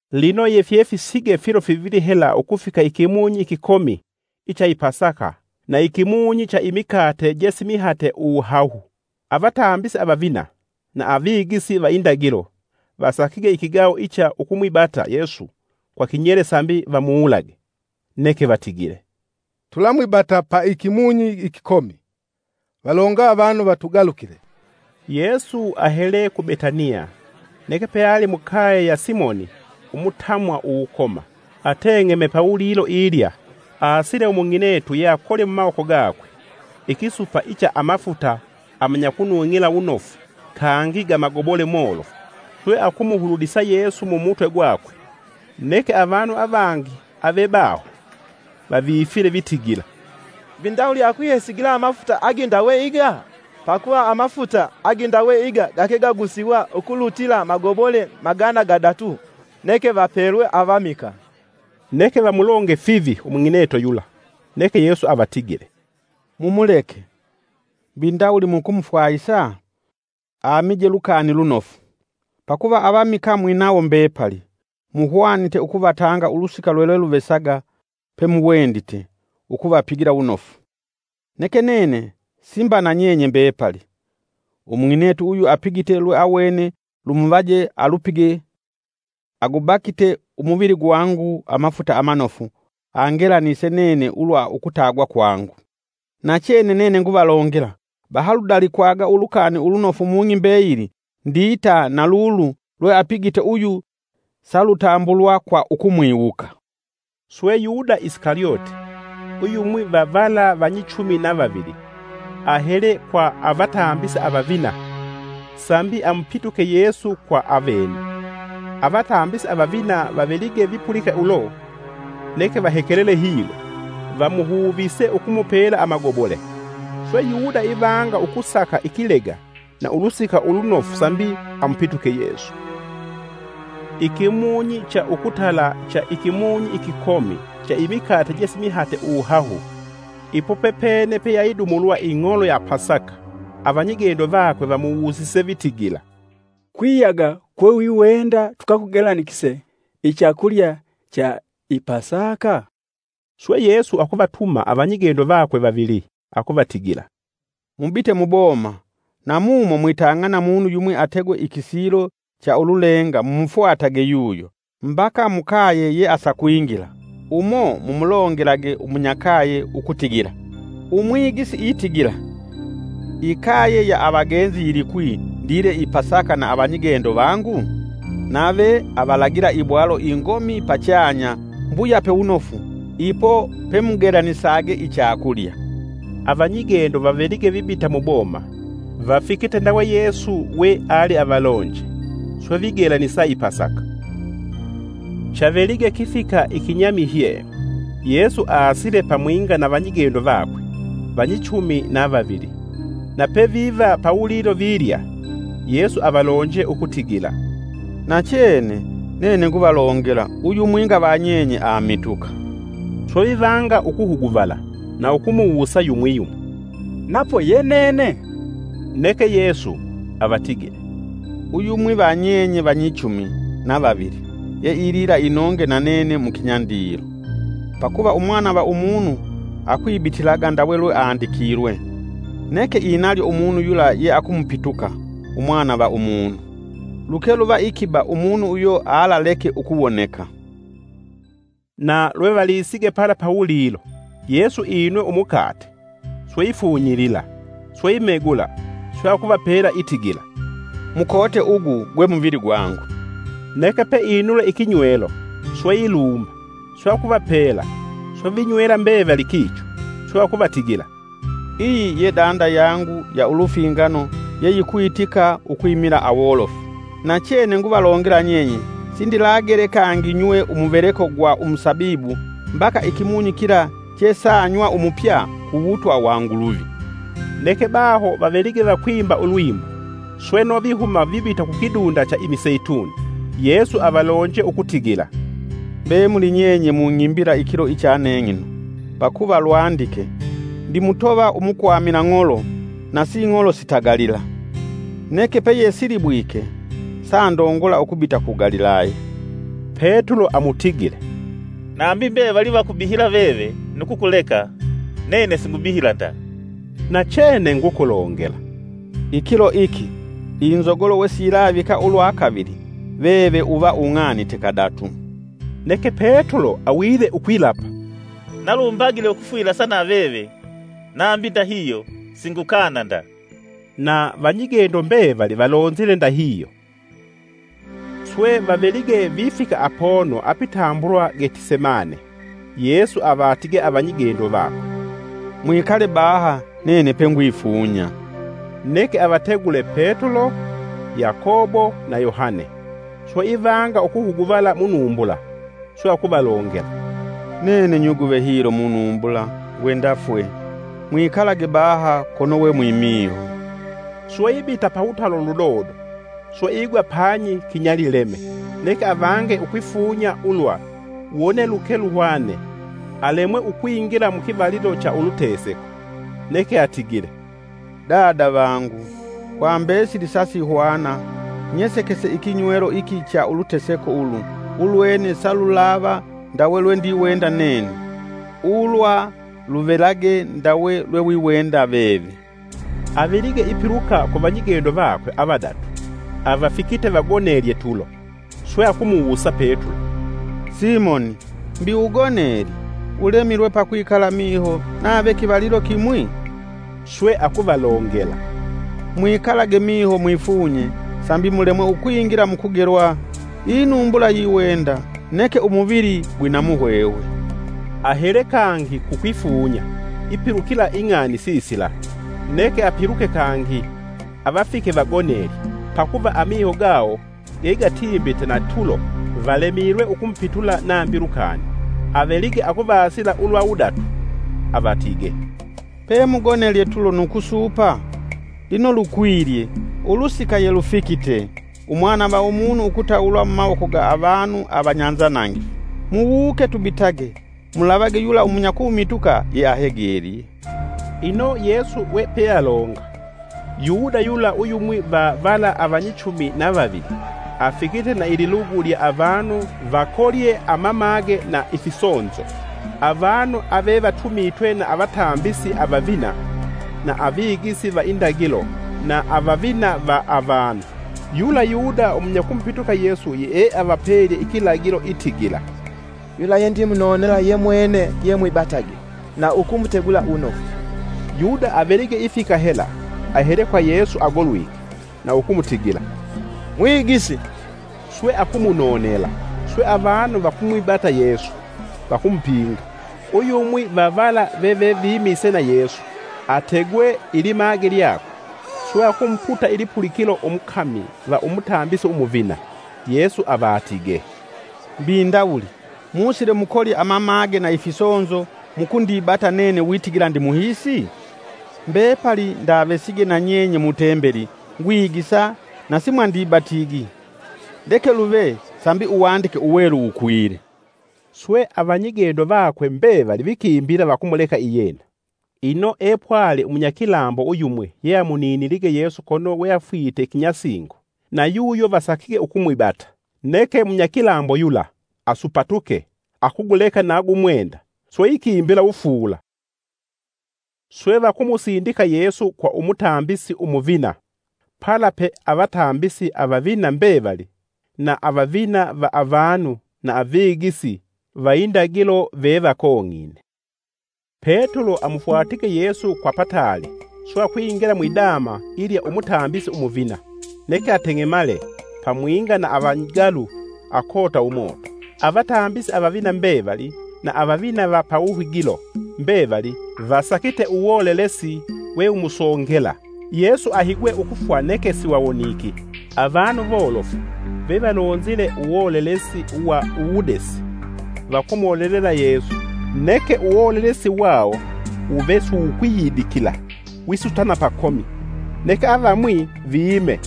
Lino yefyefisige filo fivili hela ukufika ikimunyi ikikomi icha i Pasaka na ikimunyi cha imikate je simihate uwuhahu. Avatambisi avavina na avigisi va indagilo vasakige ikigaho icha ukumwibata Yesu kwa kinyele sambi vamuwulage. Neke vatigile, “Tulamwibata ukumwibata pa ikimunyi ikikomi, valonga avanu vatugalukile.” Yesu ahele ku Betaniya neke peali mukaye ya Simoni umutamwa uwukoma, ateng'eme pawulilo ilya, aasile umung'inetu yeakolye mumawoko gakwe ikisupa icha amafuta amanyakunung'ila wunofu kangi gamagobole molofu, swe akumuhululisa Yesu mumutwe gwakwe. Neke avanu avangi avebaho vavifile, vitigila, “Mbi ndawuli akwihesigila amafuta agindawe iga? Pakuva amafuta agindawe iga gake gagusiwa ukulutila magobole magana gadatu, neke vapelwe avamikaa!” Neke vamulonge fivi umung'inetu yula. Neke Yesu avatigile, “Mumuleke; mbi ndawuli mukumufwahisa? Amije lukani lunofu. Pakuva avamikaa mwinawo mbepali, muhwanite ukuvatanga ulusika lulweluvesaga pemuwendite ukuvapigila wunofu. Neke nene si mba na nyenye mbepali. Umung'inetu uyu apigite lweawene lumuvaje alupige, agubakite umuvili gwangu amafuta amanofu angelanise nene ulwa ukutagwa kwangu. Nachene nene nguvalongela, bahaludalikwaga Ulukani Ulunofu mung'i mbeyili ndita na lulu lweapigite uyu salutambulwa kwa ukumwiwuka.” Swe Yuda Isikalyote, uyumwi va vala vanyichumi na vavili, ahele kwa avatambisi avavina sambi amupituke Yesu kwa avene. Avatambisi avavina vavelige vipulika ulo neke vahekelele hilo, vamuhuvise ukumupela amagobole. Swe Yuda ivanga ukusaka ikilega na ulusika ulunofu sambi amupituke Yesu. Ikimunyi cha ukutala cha ikimunyi ikikomi cha imikate je simihate uwuhahu, ipo pepene peyayidumulwa ing'olo ya Pasaka, avanyigendo vakwe vamuwusise vitigila, “Kwiyaga kwewiwenda tukakugelanikise ichakulya cha i Pasaka?” Swe Yesu akuvatuma avanyigendo vakwe vavili akuvatigila, “Mubite muboma, na mumo mwitang'ana munu yumwi ategwe ikisilo cha ululenga mumufwatage yuyo, mbaka mukaye yeasakwingila, umo mumulongelage umunyakaye ukutigila, ‘Umwigisi itigila: ikaye ya avagenzi ndile i Pasaka na avanyigendo vangu?’ Nave avalagila ibwalo ingomi pachanya mbuyape wunofu. Ipo pemugelasage ichakulya.” Avanyigendo vavelige vibita muboma, vafikite ndawe Yesu weavalonje. Swe vigelanisa i Pasaka. Chavelige kifika ikinyamiyhe, Yesu aasile pamwinga na vanyigendo vakwe vanyichumi na vavili. Na peviva pawulilo vilya, Yesu avalonje ukutigila, “Nachene nene nguvalongela, uyumwinga va nyenye amituka.” Swe vivanga ukuhuguvala, na ukumuwusa yumwi yumwi, “Napo ye nene?” Neke Yesu, avatigile, “Uyumwi va nyenye vanyichumi na vavili, yeilila inonge na nene mukinyandilo. Pakuva Umwana va Umunu akwibitilaga ndawe lweandikilwe, neke inalyo umunu yula yeakumupituka Umwana va Umunu! Luke luva ikiba umunu uyo alaleke ukuwoneka!” Na lwevalisige pala pawulilo, Yesu inwe umukate, swe ifunyilila, swe imegula swe akuvapela itigila, “Mukote ugu gwe muvili gwangu.” Neke peinule ikinywelo swe ilumba, swe akuvapela; swe vinywela mbevali kicho. Swe akuvatigila, “Iyi ye danda yangu ya ulufingano, yeyikwitika ukwimila awolofu. Nachene nguvalongela nyenye sindilagele kangi nywe umuveleko gwa umusabibu mbaka ikimunyi kila chesanywa umupya kuwutwa wa Nguluvi.” Neke baho vavelige vakwimba ulwimbo, sweno vihuma vibita kukidunda cha imiseituni. Yesu avalonje ukutigila, “Mbemuli nyenye mung'imbila ikilo icha neng'ino, pakuva lwandike: ‘Ndimutova umukwamila ng'olo, nasing'olo sitagalila.’ Neke peyesilibwike, sandongola ukubita ku Galilaya.” Petulo amutigile, “Nambi mbevali vakumbihila veve nu kukuleka, nene singubihila nda!” Nachene ngukulongela, “Ikilo iki, inzogolo wesiyilavika ulwakavili, veve uva ung'anite kadatu.” Neke Petulo awile ukwilapa, “Na lumbagile ukufwilasa na veve nambi ndahihyo singukana nda.” Na vanyigendo mbevali valonzile ndahihyo. Swe vavelige vifika apono apitambulwa Getisemane. Yesu avatige avanyigendo vakwe, “Mwikale baha nene pengwifunya.” Neke avategule Petulo, Yakobo na Yohane; swe ivanga ukuhuguvala munumbula. Swe akuvalongela, “Nene nyuguve hilo munumbula ngwenda fwe, mwikalage baha kono we mwimiho.” Swe ibita pawutalo ludodo swe igwa panyi kinyalileme, neke avange ukwifunya ulwa, wone luke luhwane, alemwe ukwingila mu kivalilo cha uluteseko. Neke atigile, “Dada vangu, kwa mbesili sasihwana. Nyesekese ikinywelo iki cha uluteseko ulu ulwene salulava ndawe lwendiwenda nene. Ulwa luvelage ndawe lwewiwenda veve.” Avelige ipiluka ku vanyigendo vakwe avadatu, avafikite vagonelye tulo. Swe akumuwusa Petulo, “Simoni! Mbi ugonelye? Ulemilwe pakwikala miho nave kivalilo kimwi?” Swe akuvalongela, “Mwikalage miho mwifunye sambi mulemwe ukwingila mu kugelwa. Inumbula yiwenda neke umuvili gwina muhwehwe.” Ahele kangi kukwifunya ipilukila ing'ani sisila. Neke apiluke kangi, avafike vagonelye. Pakuva amiho gawo gegatimbite na tulo valemilwe ukumupitula nambi lukani. Avelige akuvasila ulwa wudatu avatigee, “Pemugonelye tulo nu kusuupa? Lino lukwilye! Ulusika yelufikite! Umwana va Umunu ukutawulwa mumawoko ga vanu avanyanzanangifu. Muwuke, tubitage. Mulavage yula umunyakumituka yeahegelye.” Ino Yesu we pealonga, Yuda yula uyumwi va vala avanyichumi na vavili, afikite na ililugu lya avanu vakolye amamage na ifisonzo. Avanu avevatumitwe na avatambisi avavina, na avigisi va indagilo na avavina va avanu. Yula Yuda umunyakumupituka Yesu yee avapelye ikilagilo: itigila, “Yula yendimunonela yemwene, yemwibatage na ukumutegula wunofu.” Yuda avelige ifika hela, ahele kwa Yesu agolwike, na ukumutigila, “Mwigisi!” Swe akumunonela. Swe avanu vakumwibata Yesu, vakumupinga. Uyumwi va vala veve vimise na Yesu, ategwe ilimage lyakwe swe akumuputa ilipulikilo umukami va Umutambisi Umuvina. Yesu avatigee, “Mbi ndawuli, musile mukolye mamage na ifisonzo mukundibata nene witigila ndimuhiisi? Mbepali ndavesige na nyenye mu tembeli ngwigisa, na simwandibatigi. Leke luve sambi Uwandike Uwelu wukwilye.” Swe avanyigendo vakwe mbevali vikimbila vakumuleka iyena. Ino epwali umunyakilambo uyumwi yeamuminilige Yesu kono weafwite kinyasingo, nayuyo vasakige ukumwibata. Neke munyakilambo yula asupatuke akuguleka na gumwenda, swe ikimbila wufuula. Swe vakumusindika Yesu kwa umutambisi Umuvina pala pe avatambisi avavina mbevali na avavina va avanu na avigisi va indagilo vevakong'ine. Petulo amufwatige Yesu kwa pataali swe akwingila mwidama ilya Umutambisi Umuvina, neke ateng'emale pamwinga na avanyigalu akota umoto. Avatambisi avavina mbevali na avavina va pawuhigilo mbevali vasakite uwolelesi wewumusongela Yesu ahigwe ukufwa neke wuve siwawoniki. Avanu wolofu vevalonzile uwolelesi wa uwudesi vakumolelela Yesu, neke uwolelesi wawo wuve siwukwiyidikila wisutana pakomi. Neke avamwi viime,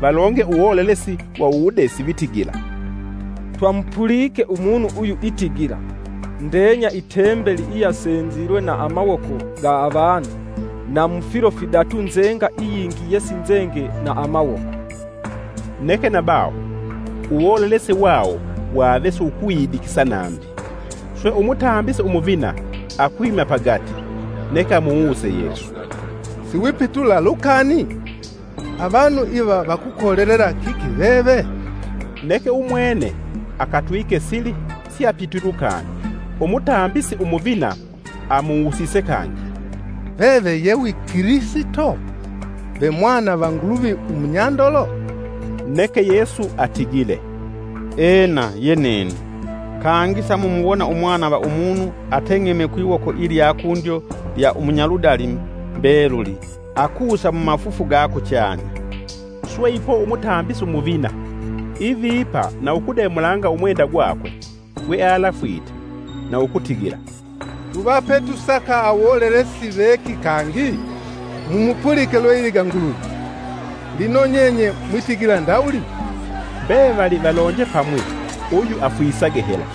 valonge uwolelesi wa uwudesi vitigila, “Twamupulike Umunu uyu itigila, ‘Ndenya itembeli iyasenzilwe na amawoko ga avanu, na mu filo fidatu nzenga iyingi yesinzenge na amawoko.’” Neke nabaho uwolelesi wawo wave siwikwiyidikisa nambi. Swe Umutambisi Umuvina, akwima pagati, neke amuwuse Yesu, “Siwipitula lukani? Avanu iva vakukolelela kiki veve?” Neke Umwene akatwike sili siapitwi lukani. Umutambisi Umuvina amuwusise kangi, “Veve ye wi Kilisito, ve Mwana va Nguluvi umunyandolo?” Neke Yesu atigile, “Ena ye nene. Kangi samumuwona Umwana va Umunu ateng'eme kwiwoko ilya kundyo lya umunyaludali mbeluli akusa mumafufu ga kuchanya.” Swe ipo Umutambisi Umuvina, ivipa na ukudemulanga umwenda gwakwe gwealafwite na ukutigila, “Tuvapetusaka awolelesi veki kangi? Mumupulike lwe iliga Nguluvi! Lino nyenye mwitigila ndawuli?” Mbevali valonje pamwi uyu afwisage hela.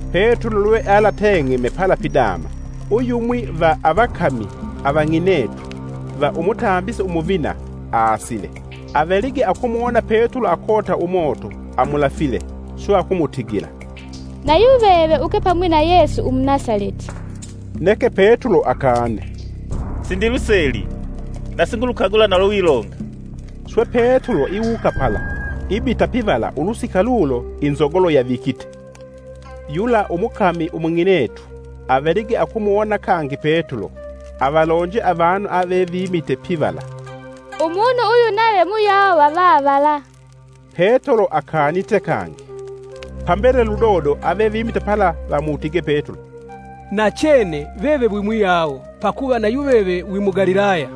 Petulo lwealateng'eme pala pidama, uyumwi va avakami avang'inetu va umutambisi umuvina aasile. Avelige akumuwona Petulo akota umoto, amulafile, swe akumutigila, “Nayuveve uke pamwi na Yesu Umunasaleti.” Neke Petulo akane, “Sindiluseli, na singulukagula na lwe wilonga!” Swe Petulo iwuka pala, ibita pivala ulusika lulo inzogolo yavikite. Yula umukami umung'inetu avelige akumuwona kangi Petulo, avalonje avanu ave vimite pivala, “Umunu uyu nave muyawe va vavala.” Petulo akanite kangi. Pambele ludodo, avevimite pala vamutige Petulo, “Nachene veve wimuyavo, pakuva nayuveve wi Mugalilaya.”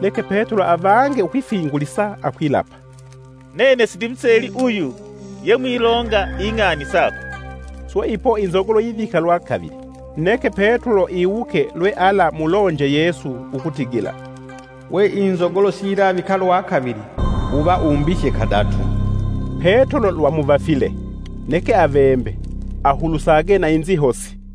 Neke Petulo avange ukwifingulisa akwilapa, “Nene sindimuseli uyu yemwilonga ing'ani sakwe” Swe ipo inzogolo yivika lwa kavili. Neke Petulo iwuke lwealamulonje Yesu ukutigila, “We inzogolo siyilavika lwa kavili, uva umbihye kadatu.” Petulo lwamuvafile neke avembe ahulusage na inzihosi.